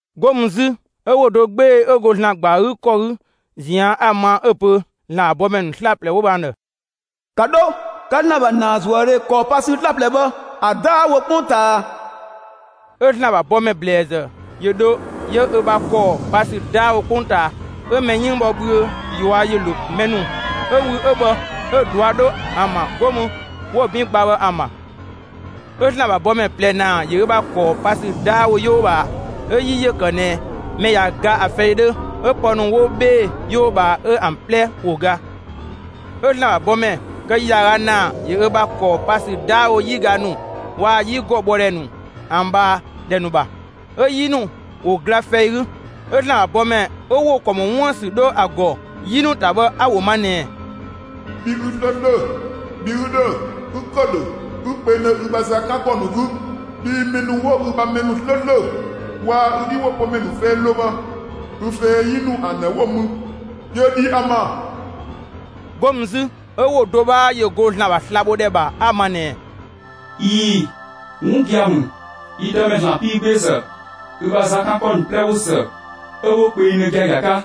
'Go mü 'zü, 'ö ‑wo do 'gbee‑ 'ö go ‑Zlan ‑gba ‑a 'gü ‑kɔ 'gü ꞊zian' 'a‑ ma; 'ö‑ pö ‑Zlan ‑bha bɔmɛ ‑nu 'slaplɛ 'wo bhë ‑an ‑dhë: «‑Ka 'dho 'ka ‑Zlan ‑bha ‑naazuëdhe ‑kɔɔ pa ‑sü 'slaplɛ bhë ‑a 'daawo 'kpongtaa!» 'Ö ‑Zlan ‑bha bɔmɛ ‑blɛɛzë ‑yö dho 'yö ö bha ‑kɔɔ pa ‑sü 'daawo 'kpongtaa. 'Ö mɛ 'yënng bhɔ bhüö ꞊yua' ‑yö ‑lo mɛ ‑nu 'ö wü 'ö bhë 'ö‑ ꞊dua' 'dho ‑an ‑bha, 'go mü 'wo‑ 'bin gba bhë ‑an ‑bha. 'Ö ‑Zlan ‑bha bɔmɛ ꞊plɛ ‑naa ‑yö ö ‑bha ‑kɔɔ pa ‑sü 'daawo 'yoo ꞊bhaa. 'Ö 'yi ‑yö ‑kë ꞊nɛ mɛ ꞊ya ga ‑a fɛi 'dhö, 'ö pë ‑nu 'wo 'bhee‑ 'yoo ꞊bhaa, 'ö ‑an 'plɛ ‑wo ga. 'Ö ‑Zlan ‑bha bɔmɛ kë ‑yaaga ‑naa ‑yö ö ‑bha ‑kɔɔ pa ‑sü 'daawo 'yiga ‑nu waa‑ 'yigɔ bhɔ ‑dhɛ ‑nu ‑an ꞊bhaa ‑dhɛ ‑nu ‑bha; 'ö 'yi ‑nu ‑wo ‑gla fɛi 'gü. 'Ö ‑Zlan ‑bha bɔmɛ 'ö ‑wo ‑kɔ ‑mɔ 'wuën‑ ‑sü 'dho ‑a ‑gɔ 'yi ‑nu ‑ta bhë 'a‑ ‑wo ma ꞊nɛɛ: «Bhi 'ü 'slööslö, bhi 'ü ‑dhö, 'ü ‑kë ‑dhö, ü kpengdhö ü ‑bha za 'kan ‑kɔ ‑nu 'gü. Bhii mɛ ‑nu 'wo ü ‑bha mɛ ‑nu 'slööslö waa‑ ü 'dhiwopömɛ ‑nu fɛi ‑lo bhë, ü fɛi 'yi nu ‑an ‑dhë 'wo‑ mü; ‑yö ‑dhi ‑an ‑bha.» 'Go mü 'zü, 'ö ‑wo do 'bhaa ‑yö go ‑Zlan ‑bha slabhodhɛ ‑bha 'a‑ ma ꞊nɛɛ: «꞊Ii‑, 'wun gia‑ ‑mü, yi Dëmɛ ‑Zlan 'piigbeezë, ü bha za 'kan ‑kɔ ‑nu 'plɛ ꞊wo ‑së 'ö 'wo kpengdhö giagia 'ka!»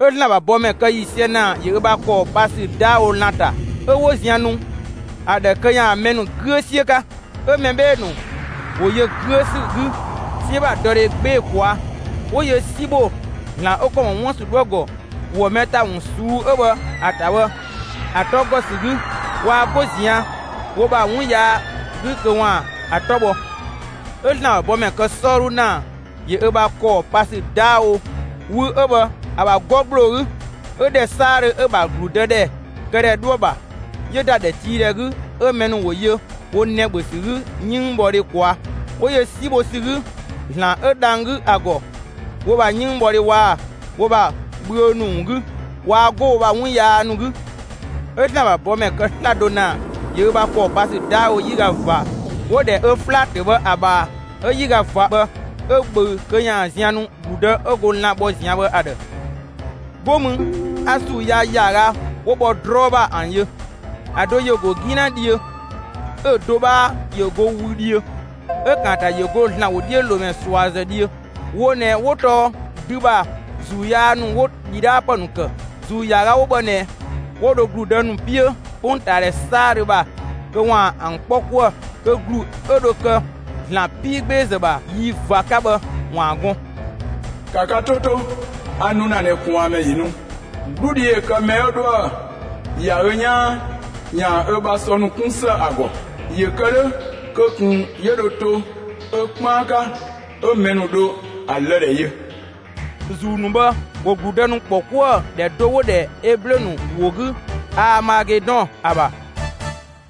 'Ö ‑Zlan ‑bha bɔmɛ kë ‑yiisië ‑naa ‑yö ö bha ‑kɔɔ pa ‑sü 'daawo lan‑ ‑ta 'ö 'wo zian nu ‑a ‑dhë kö ‑yaan mɛ ‑nu 'güö 'siö 'ka. 'Ö mɛ 'bhee‑ ‑nu ‑wo yö 'güö ‑sü 'gü 'siö ‑bha dɔdhe 'gbee‑ ꞊kwaa'; 'wo yö 'si ‑bho ‑Zlan 'ö ‑kɔ ‑mɔ 'wuën‑ ‑sü 'dhoë‑ ‑gɔ ‑wɔ mɛ ‑ta ‑wun ꞊suu'‑ 'ö bhë ‑a ‑ta bhë, ‑a 'tɔ ‑gɔ ‑sü 'gü; waa 'go ꞊zian' wo ‑bha 'wun yaa 'gü kö ‑waan ‑a 'tɔ bhɔ. 'Ö ‑Zlan ‑bha bɔmɛ kë 'sɔɔdhu ‑naa ‑yö ö ‑bha ‑kɔɔ pa ‑sü 'daawo wü 'ö bhë ‑a ‑bha 'gɔ ‑gbloo 'gü, 'ö ‑dhɛ 'saadhö 'ö‑ ‑bha ‑gludëdhɛkëdhɛ 'dhoë‑ ‑bha 'yö ‑da ‑dhɛtiidhɛ 'gü, 'ö mɛ ‑nu ‑wo yö wo nɛ‑ ‑bhö ‑sü 'gü 'yënngbhɔdhe ꞊kwaa'. 'Wo yö 'si bho ‑sü 'gü ‑Zlan 'ö dhang‑ 'gü ‑a ‑gɔ, wo ‑bha 'yënngbhɔdhe waa‑ wo ‑bha bhüö ‑nu ‑wun 'gü; waa 'go wo ‑bha 'wun yaa ‑nu 'gü. 'Ö ‑Zlan ‑bha bɔmɛ kë 'slado ‑naa ‑yö ö ‑bha ‑kɔɔ pa ‑sü 'daawo 'yiga ꞊va 'wo‑ ‑dhɛ öflatö bhë ‑a ꞊bhaa. 'Ö 'yiga ꞊va bhë 'ö ꞊bhöü kö ‑yaan zian nu ‑gludë 'ö go lan‑ bhɔ ꞊zian' bhë ‑a ‑dhë. 'Go mü 'a ‑zuu yaa ‑yaaga 'wo bhɔ 'drɔɔ ‑bha ‑an yö: ‑A do ‑yö ‑go 'gina dhiö, 'ö‑ do 'bhaa ‑yö go wü dhiö, 'ö‑ ‑kaanta ‑yö go ‑Zlan ‑wodhiölomɛ ꞊suazë dhiö. Wo ꞊nɛ 'wo tɔɔ dü ‑bha ‑zuu yaa ‑nu 'wo ‑dhidhaapë ‑nu ‑kë. ‑Zuu ‑yaaga 'wo bhë ꞊nɛ 'wo dho ‑gludë ‑nu 'piö 'kpongtaadhɛ 'saadhö ‑bha, kö ‑waan ‑an 'kpɔ 'kuë‑ kö ‑glu 'ö dho kë ‑Zlan 'piigbeezë ‑bha yi ꞊va 'ka bhë ‑waan gɔn. ‑Ka ka 'to 'to, a nu ‑na ꞊nɛ ꞊kwaanmɛ ‑yö nu. 'Gludhi ‑yö kë mɛ 'ö 'dhoë‑ ‑ya ö 'yaan ‑yaan ö ‑bha sɔ ‑nu 'kun ‑së ‑a ‑gɔ, ‑yö kë 'dhö kö ꞊kun 'yö dho to ö 'kpaan 'ka 'ö mɛ ‑nu dho ‑a lë‑ ‑dhɛ yö. ‑Zuu ‑nu bhë ‑wo ‑gludë ‑nu ‑kpɔ 'kuë‑ ‑dhɛ do 'wo‑ ‑dhɛ Eblö ‑nu ‑wo 'gü Aamagedɔn ‑a ‑bha.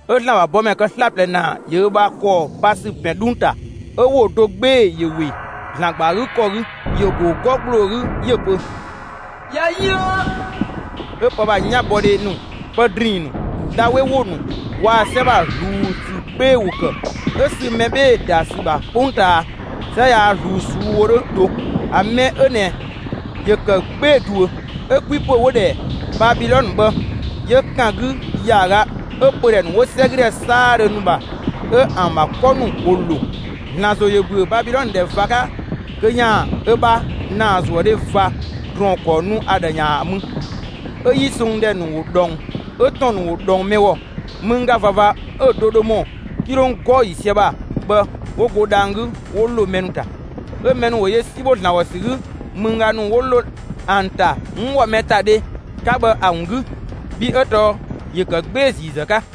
'Ö ‑Zlan ‑bha bɔmɛ kë 'slaplɛ ‑naa ‑yö ö ‑bha ‑kɔɔ pa ‑sü ‑pɛn 'dhung‑ ‑ta. 'Ö ‑wo do 'gbee‑ ‑yö ‑we ‑Zlan ‑gba ‑a 'gü ‑kɔ 'gü; ‑yö ‑go 'gɔ ‑gbloo 'gü 'yö‑ pö: «꞊Ya yën!» 'Ö pë ‑bha 'yanbɔdhe ‑nu, pë ‑drinng ‑nu, dha 'we ‑wo ‑nu waa‑ 'sɛ ‑bha ꞊zluun ‑sü 'gbee‑ ‑wo ‑kë. 'Ö sü mɛ 'bhee‑ ‑da ‑sü ‑bha 'kpongtaa 'sɛ yaa ꞊zluun ꞊suu'‑ wo 'dhö do; ‑a mɛ 'ö ꞊nɛ ‑yö ‑kë 'gbee‑ ꞊duö! 'Ö 'kwipö ('wo‑ ‑dhɛ Babilɔnë) bhë 'yö ‑kan 'gü ‑yaaga, 'ö pödhɛ ‑nu 'wo 'sɛgüdhɛ 'saadhö ‑nu ‑bha 'ö ‑an ‑bha 'kɔ ‑nu ‑wo ‑lo. ‑Zlan ‑zo ‑yö ‑bhüö Babilɔnë ‑dhɛ ꞊va 'ka kö ‑yaan ö bha ‑naazuëdhe ꞊va ‑drɔɔn ‑kɔɔ nu ‑a ‑dhë ‑yaan ‑a mü. 'Ö 'yi songdhɛ ‑nu ‑wo ꞊dhɔng, 'ö ‑tɔn ‑nu ‑wo ꞊dhɔng mɛ ‑gɔ. Mëngga ꞊vava 'ö‑ do dho ‑mɔ 'kilong 'gɔɔ‑ ‑yiisië ‑bha bhë 'wo go dhang‑ 'gü 'wo ‑lo mɛ ‑nu ‑ta. 'Ö mɛ ‑nu ‑wo yö 'si ‑bho ‑Zlan ‑gɔ ‑sü 'gü mëngga ‑nu 'wo ‑lo ‑an ‑ta 'wun ‑wɔ mɛ ‑ta dhe 'ka bhë ‑a ‑wun 'gü. Bhii 'ö tɔɔ ‑yö ‑kë 'gbee‑ ‑ziizë 'ka.